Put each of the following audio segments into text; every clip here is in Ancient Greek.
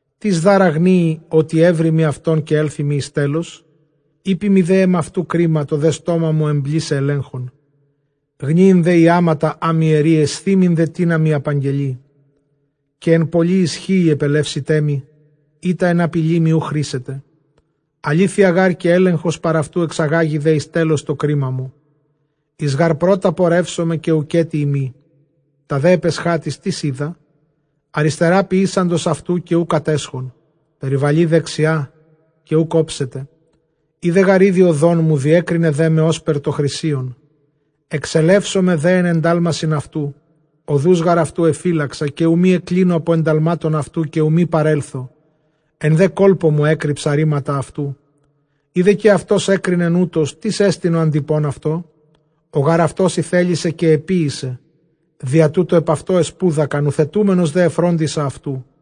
Τίς δʼ ἄρα γνοίη, ὅτι εὕροιμι αὐτὸν, καὶ ἔλθοιμι εἰς τέλος; Εἴποιμι δὲ ἐμαυτοῦ κρίμα, τὸ δὲ στόμα μου ἐμπλήσαι ἐλέγχων. Γνοίην δὲ ἰάματα ἅ μοι ἐρεῖ, αἰσθοίμην δὲ τίνα μοι ἀπαγγελεῖ. Καὶ ἐν πολλῇ ἰσχύϊ ἐπελεύσεταί μοι, εἶτα ἐν ἀπειλῇ μοι οὐ χρήσεται. Ἀλήθεια γὰρ καὶ ἔλεγχος παρʼ αὐτοῦ, ἐξαγάγοι δὲ εἰς τέλος τὸ κρίμα μου. Εἰ γὰρ πρῶτος πορεύσομαι, καὶ οὐκ ἔτι εἰμὶ, τὰ δὲ ἐπʼ ἐσχάτοις, τί οἶδα; Ἀριστερὰ ποιήσαντος αὐτοῦ καὶ οὐ κατέσχον, περιβαλεῖ δεξιὰ καὶ οὐκ ὄψομαι· Οἶδε γὰρ ἤδη ὁδόν μου· διέκρινε δέ με ὥσπερ τὸ χρυσίον. Ἐξελεύσομαι δὲ ἐν ἐντάλμασιν αὐτοῦ, ὁδοὺς γὰρ αὐτοῦ ἐφύλαξα, καὶ οὐ μὴ ἐκκλίνω ἀπὸ ἐνταλμάτων αὐτοῦ, καὶ οὐ μὴ παρέλθω, ἐν δὲ κόλπῳ μου ἔκρυψα ῥήματα αὐτοῦ. Εἰ δὲ καὶ αὐτὸς ἔκρινεν οὕτως, τίς ἐστιν ὁ ἀντειπὼν αὐτῷ; ὁ γὰρ αὐτὸς ἠθέλησε, καὶ ἐποίησε. Διὰ τοῦτο ἐπʼ αὐτῷ ἐσπούδακα· νουθετούμενος δὲ, ἐφρόντισα αὐτοῦ.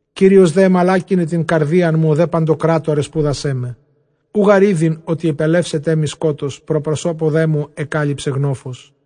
Κύριος δὲ ἐμαλάκυνε τὴν καρδίαν μου· ὁ δὲ παντοκράτωρ ἐσπούδασέ με. Οὐ γὰρ ᾔδειν ὅτι ἐπελεύσεταί μοι σκότος, πρὸ προσώπου δέ μου ἐκάλυψε γνόφος.